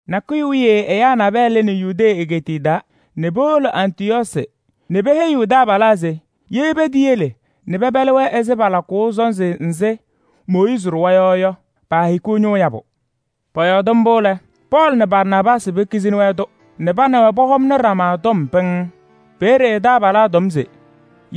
Nakʋyʋ wiye ɛyaa nabɛyɛ lɩnɩ Yudee egeetiye taa nɛ powolo Antɩyɔɔsɩ nɛ peheyiɣ taabalaa se ye peteyele nɛ pɛpɛlɩ-wɛ ɛzɩ palakʋʋ sɔnzɩ nzɩ Mooyiizi ɖʋwa yɔ yɔ, paahikiɣ ñʋʋ yabʋ. Pɔyɔɔdɩ mbʋ lɛ, Pɔɔlɩ nɛ Barnaabaasɩ pekizini-wɛ-tʋ nɛ pa nɛ wɛ pɔhɔmnɩ ɖama tɔm pɩŋŋ. Peeye taabalaa tɔm se: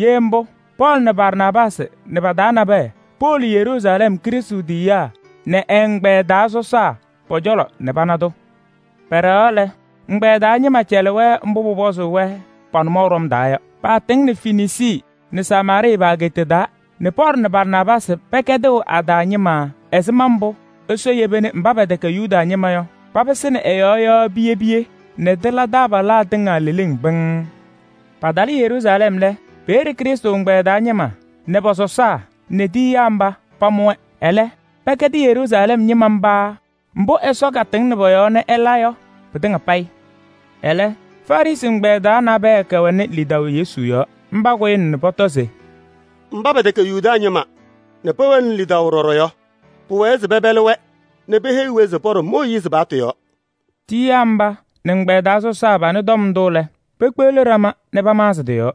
ye mbʋ, Pɔɔlɩ nɛ Barnaabaasɩ nɛ pa-taa nabɛyɛ powolo Yeruusalɛm, Krɩstʋ tiyiyaa nɛ ɛ-ɛgbɛyɛ taa sɔsaa pɔ-cɔlɔ nɛ pana-tʋ. Pɛɖɛɣaɣ lɛ, ɛgbɛyɛ taa ñɩma cɛlɩ-wɛ mbʋ pʋpɔzʋʋ-wɛ pa-nʋmɔʋ ɖɔm taa yɔ. Paatɩŋnɩ Fenisii nɛ Samaarɩɩ pa-ageeta taa nɛ Pɔɔlɩ nɛ Barnaabaasɩ pɛkɛdɩɣ a-taa ñɩma ɛzɩma mbʋ Ɛsɔ yeba nɛ mba pɛtɛkɛ Yuda ñɩma yɔ papɩsɩnɩ ɛ-yɔɔ yɔ piye piye nɛ tɩla taabalaa tɩŋa leleŋ pɩŋŋ. Patalɩ Yeruusalɛm lɛ, peeye Krɩstʋ ɛgbɛyɛ taa ñɩma nɛ pɔ-sɔsaa nɛ tiyiyaa mba pamʋ-wɛ. Ɛlɛ pɛkɛdɩ Yeruusalɛm ñɩma mba mbʋ Ɛsɔ katɩŋnɩ pɔ-yɔɔ nɛ ɛla yɔ pɩtɩŋa payɩ. Ɛlɛ, Farɩsɩ ɛgbɛyɛ taa nabɛyɛ kɛwɛnɩ lidaʋ Yesu yɔɔ. Mba kʋyɩna nɛ pɔtɔ se: “Mba pɛtɛkɛ Yuda ñɩma nɛ pɛwɛnɩ lidaʋ ɖɔɖɔ yɔ, pʋwɛɛ se pɛpɛlɩ-wɛ nɛ peheyi-wɛ se pɔɖɔ Mooyiizi paɣtʋ yɔɔ.” Tiyiyaa mba nɛ ɛgbɛyɛ taa sɔsaa panɩ tɔm ndʋ lɛ, pekpeɣli ɖama nɛ pamaɣzɩ tɩ-yɔɔ.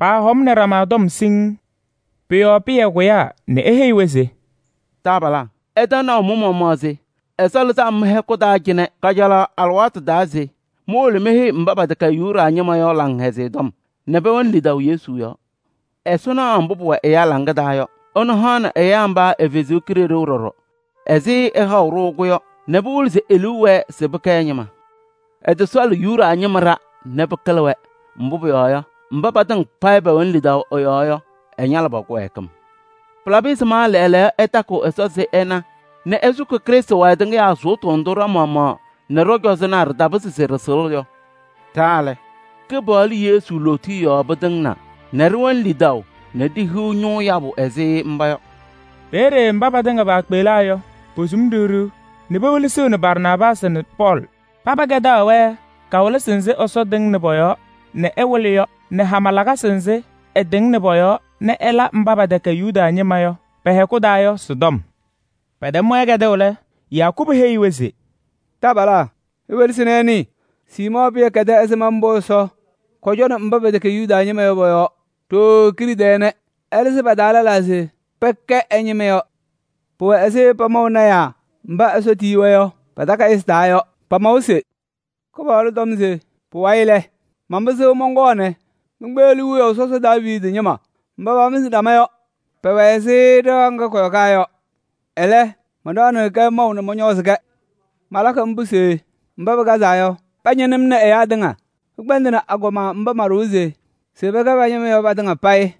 Paahɔmnɩ ɖama tɔm siŋŋ. Pʋ-yɔɔ Pɩyɛ kʋyaa nɛ eheyi-wɛ se: “Taabalaa! Ɩtɛm naʋ mɩ-maɣmaɣ se Ɛsɔ lɩzɩ-m mɩ-hɛkʋ taa cɩnɛ kajalaɣ alɩwaatʋ taa se mowolo meheyi mba pɛtɛkɛ Yuda ñɩma yɔ Laŋhɛzɩyɛ Tɔm nɛ pɛwɛnɩ lidaʋ Yesu yɔɔ. Ɛsɔ naɣ mbʋ pʋwɛ ɛyaa hɔ taa yɔ, ɛnʋ hanɩ ɛyaa mba ɛ-Kalɩzaɣ ɖɔɖɔ ɛzɩ ɛhaʋ-ɖʋ-kɛ yɔ nɛ pɩwɩlɩ se e-liu wɛɛ se pɛkɛ ɛ-ñɩma. Ɛtɔsɔɔlɩ Yuda ñɩma ɖa nɛ pɩkɩlɩ-wɛ, mbʋ pʋyɔɔ yɔ, mba patɩŋa payɩ pɛwɛnɩ lidaʋ ɛ-yɔɔ yɔ, ɛñalɩ pa-kɩwɛɛkɩm. Pɩlabɩ ɛzɩma lɛɛlɛɛyɔ ɩtakɩɣ Ɛsɔ se ɩna nɛ ɩsʋkɩ Krɩstʋ wayɩ tɩŋɩyaa sʋʋtʋ ndʋ ɖa-maɣmaɣ nɛ ɖɔ-cɔzɔnaa ɖɩtapɩzɩ se ɖɩsɩɣlɩ yɔ? Ɖa lɛ, Kɩpaɣlʋ Yesu lootiye yɔɔ pɩtɩŋnaa nɛ ɖɩwɛnɩ lidaʋ nɛ ɖihiɣ ñʋʋ yabʋ ɛzɩ mba yɔ.” Peeye mba patɩŋa paakpeɣlaa yɔ, posum ɖiɣ ɖiɣ nɛ pewelesiɣni Barnaabaasɩ nɛ Pɔɔlɩ. Paba kɛdaɣ-wɛ kawɩlɩsɩ nzɩ Ɛsɔ tɩŋnɩ pɔ-yɔɔ nɛ ɛwɩlɩ yɔ nɛ hama lakasɩ nzɩ ɛtɩŋnɩ pɔ-yɔɔ nɛ ɛla mba pɛtɛkɛ Yuda ñɩma yɔ pɛ-hɛkʋ taa yɔ sɩ-tɔm. Pɛtɛm-wɛ kɛdʋʋ lɛ, Yakubu heyi-wɛ se: “Taabalaa! Iwelesi nɛ ɩnɩɩ. Siimɔɔ Pɩyɛ kɛdɩ ɛzɩma mbʋ Ɛsɔ kɔcɔnɩ mba pɛtɛkɛ Yuda ñɩma yɔ pɔ-yɔɔ ɖooo kiɖe tɛɛ nɛ ɛlɩzɩ pa-taa lɛlaa se pɛkɛ ɛ-ñɩma yɔ. Pʋwɛ ɛzɩ pamaʋ lɔɔyɩsɩ tɩnaa takayɩsɩ taa yɔ. Pamawa se: ‘Kɩpaɣlʋ tɔm se: pʋwayɩ lɛ, manpɩsɩɣ mɔnkɔɔ nɛ menkpeɣli wiyaʋ sɔsɔ Daaviidi ñɩma mba pamɩzɩ ɖama yɔ: pɛwɛ ɛzɩ ɖɩɣa ŋga kɔyɔkaa yɔ. Ɛlɛ, manɖaɣnɩɣ-kɛ maʋ nɛ mɔñɔɔzɩ-kɛ. Malakɩ mbʋ se mba pɩkazaa yɔ, pañɩnɩ-m nɛ pɩkpɛndɩnɩ agɔma mba manɖʋwa se pɛkɛ ma-ñɩma yɔ patɩŋa payɩ.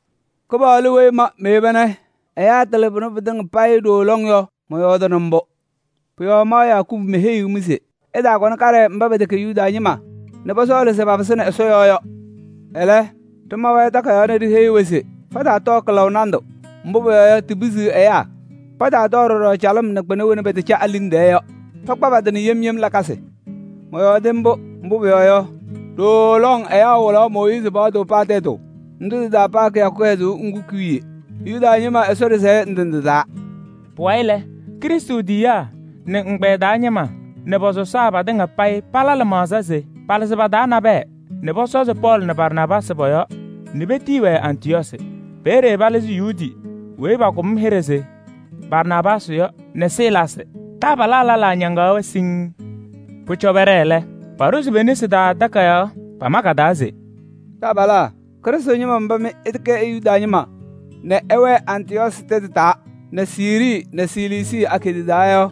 Kɩpaɣlʋ weyi ma meyeba nɛ ɛyaa tɩlɩ pʋnɛ pɩtɩŋa payɩ ɖooo lɔŋ yɔ, mɔyɔɔdɩnɩ mbʋ.’ Pʋ-yɔɔ ma Yakubu meheyiɣ-mɩ se ɩtaakɔnɩ kaɖɛ mba pɛtɛkɛ Yuda ñɩma nɛ pɔsɔɔlɩ se papɩsɩnɩ Ɛsɔ yɔɔ yɔ. Ɛlɛ, ɖɩma-wɛ takayaɣ nɛ ɖiheyi-wɛ se pataatɔɔ kɩlaʋ nandʋ, mbʋ pʋyɔɔ yɔ, tipisiɣ ɛyaa. Pataatɔɔ ɖɔɖɔ calɩm nɛ kpɩna wena pɛtɛcɛ a-liŋ tɛɛ yɔ. Pakpa pa-tɩ nɛ yem yem lakasɩ. Mɔyɔɔdɩ mbʋ, mbʋ pʋyɔɔ yɔ, ɖooo lɔŋ ɛyaa wɩlaɣ Mooyiizi paɣtʋ paa tɛtʋ ndʋ tɩ-taa paa kɩyakʋ kɩhɛzʋʋ ŋgʋ ki-wiye Yuda ñɩma Ɛsɔ ɖɩsɛyɛ ndɩ ndɩ taa.” Pʋwayɩ lɛ, Krɩstʋ tiyiyaa nɛ ɛ-ɛgbɛyɛ taa ñɩma nɛ pɔ-sɔsaa, patɩŋa payɩ pala lɩmaɣza se palɩzɩ pa-taa nabɛyɛ nɛ pɔsɔzɩ Pɔɔlɩ nɛ Barnaabaasɩ pɔ-yɔɔ nɛ petiyi-wɛ Antɩyɔɔsɩ. Peeye palɩzɩ Yuudi weyi pakʋm hɩɖɛ se Barsaabaasɩ yɔ nɛ Silaasɩ. Taabalaa lɛlaa ñaŋaɣ-wɛ siŋŋ. Pʋcɔ pɛɖɛɛ lɛ, paɖʋzɩ pe-nesi taa takayaɣ. Pama ka-taa se: “Taabalaa, Krɩstʋ ñɩma mba mɩ ɩtɛkɛ Yuda ñɩma nɛ ɩwɛɛ Antɩyɔɔsɩ tɛtʋ taa nɛ Siirii nɛ Siliisii pa-ageeta taa yɔ!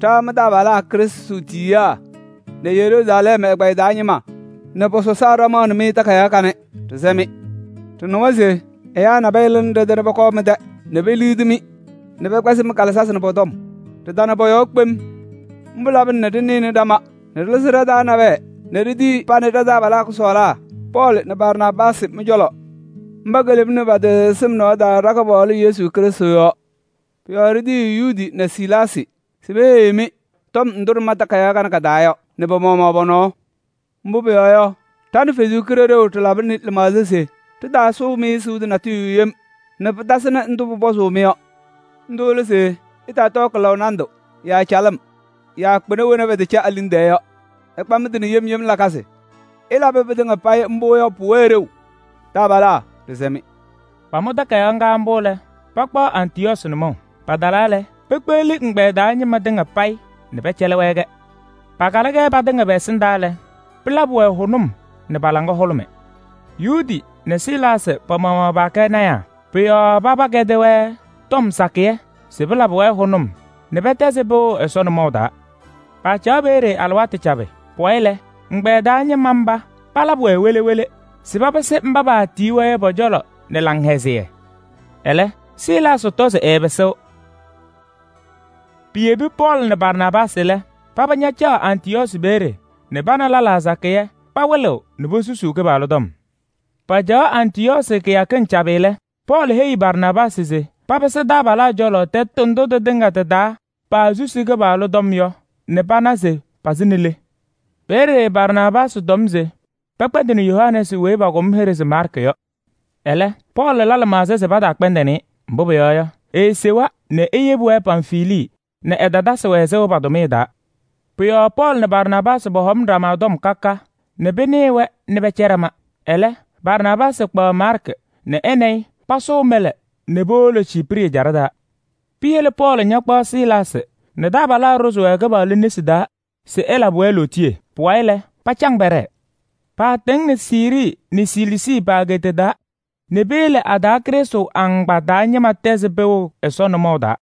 Ɖa mɩ-taabalaa Krɩstʋ tiyiyaa nɛ Yeruusalɛm ɛgbɛyɛ taa ñɩma nɛ pɔ-sɔsaa ɖɩmaɣnɩ-mɩ takayaɣ kanɛ, ɖɩsɛ-mɩ! Ɖɩnɩwa se ɛyaa nabɛyɛ lɩnɩ ɖɛ-tɛ nɛ pɔkɔɔ mɩ-tɛ nɛ peliɣti-mɩ nɛ pɛkpɛzɩ mɩ-kalɩzasɩ nɛ pɔ-tɔm. Ɖɩtana pɔ-yɔɔ kpem. Mbʋ labɩna nɛ ɖɩnɩnɩ ɖama nɛ ɖɩlɩzɩ ɖa-taa nabɛyɛ nɛ ɖitiyi pa nɛ taabalaa kʋsɔɔlaa Pɔɔlɩ nɛ Barnaabaasɩ mɩ-cɔlɔ. Mba kelemni pa-tɩ sɩm nɔɔ taa ɖa-Kɩpaɣlʋ Yesu Krɩstʋ yɔɔ. Pʋ-yɔɔ ɖitiyiɣ Yuudi nɛ Silaasɩ se peheyi-mɩ tɔm ndʋ ɖɩma takayaɣ kanɛ ka-taa yɔ nɛ pa-maɣmaɣ pɔ-nɔɔ. Mbʋ pʋyɔɔ yɔ, ɖa nɛ Ɛsɔ Kalɩzaɣ ɖɩlabɩ lɩmaɣza se ɖɩtaasʋʋ-mɩ sʋʋtʋ natʋyʋ yem nɛ pɩtasɩnɩ ndʋ pʋpɔzʋʋ-mɩ yɔ. Ndʋ lɛ se: ɩtaatɔɔ kɩlaʋ nandʋ yaa calɩm yaa kpɩna wena pɛtɛcɛ a-liŋ tɛɛ yɔ. Ɩkpa mɩ-tɩ nɛ yem yem lakasɩ. Ɩlabɩ pɩtɩŋa payɩ mbʋ yɔ, pʋwɛɣ ɖeu. Taabalaa, ɖɩsɛ-mɩ!” Pamʋ takayaɣ ŋga mbʋ lɛ, pakpaɣ Antɩyɔɔsɩ nʋmɔʋ. Patalaa lɛ, pekpeɣli ɛgbɛyɛ taa ñɩma tɩŋa payɩ nɛ pɛcɛlɩ-wɛ-kɛ. Pakalɩ-kɛ patɩŋa pɛ-ɛsɩndaa lɛ, pɩlabɩ-wɛ hʋnʋm nɛ pa-laŋa hʋlʋmɩ. Yuudi nɛ Silaasɩ pa-maɣmaɣ paakɛ lɔɔyɩsɩ tɩnaa. Pʋ-yɔɔ paba ñɛkɛdɩ-wɛ tɔm sakɩyɛ se pɩlabɩ-wɛ hʋnʋm nɛ pɛtɛzɩ pɩʋ Ɛsɔ nʋmɔʋ taa. Paacaɣ peeye alɩwaatʋ cabɩ. Pʋwayɩ lɛ, ɛgbɛyɛ taa ñɩma mba palabɩ-wɛ wele wele se papɩsɩ mba paatiyi-wɛ yɔ pɔ-cɔlɔ nɛ laŋhɛzɩyɛ. [ Ɛlɛ, Silaasɩ tɔ se ɛɛpɩsɩɣ.] Piyebi Pɔɔlɩ nɛ Barnaabaasɩ lɛ, paba ñacaɣ Antɩyɔɔsɩ peeye nɛ pa nɛ lɛlaa sakɩyɛ pawɩlɩɣ nɛ posusuu Kɩpaɣlʋ tɔm. Pacaɣ Antɩyɔɔsɩ kɩyakɩŋ cabɩ lɛ, Pɔɔlɩ heyi Barnaabaasɩ se papɩsɩ taabalaa cɔlɔ tɛtʋ ndʋ tɩtɩŋa tɩ-taa paasusi Kɩpaɣlʋ tɔm yɔ nɛ pana se pɩsɩnɩ le. Peeye Barnaabaasɩ tɔm se pɛkpɛndɩnɩ Yohanɛɛsɩ weyi pakʋm hɩɖɛ se Maarkɩ yɔ. Ɛlɛ, Pɔɔlɩ la lɩmaɣza se pataakpɛndɩnɩ-ɩ. Mbʋ pʋyɔɔ yɔ, eesewa nɛ eyebi-wɛ Pamfilii nɛ ɛtatasɩ-wɛ sɩʋ pa-tʋmɩyɛ taa. Pʋ-yɔɔ Pɔɔlɩ nɛ Barnaabaasɩ pɔhɔmnɩ ɖama tɔm ka ka nɛ pɩnɩɩ-wɛ nɛ pɛcɛ ɖama. Ɛlɛ, Barnaabaasɩ kpaɣ Maarkɩ nɛ ɛ nɛ ɩ pasʋʋ mɛlɛ nɛ powolo Ciiprɩ ɛjaɖɛ taa. Piyele Pɔɔlɩ ñakpaɣ Silaasɩ nɛ taabalaa ɖʋzɩ-wɛ Kɩpaɣlʋ nesi taa se ɛlabɩ-wɛ lootiye. Pʋwayɩ lɛ, pacaŋ pɛɖɛɛ. Paatɩŋnɩ Siirii nɛ Siliisii pa-ageeta taa nɛ peyele a-taa Krɩstʋ agbaa taa ñɩma tɛzɩ pɩʋ Ɛsɔ nʋmɔʋ taa.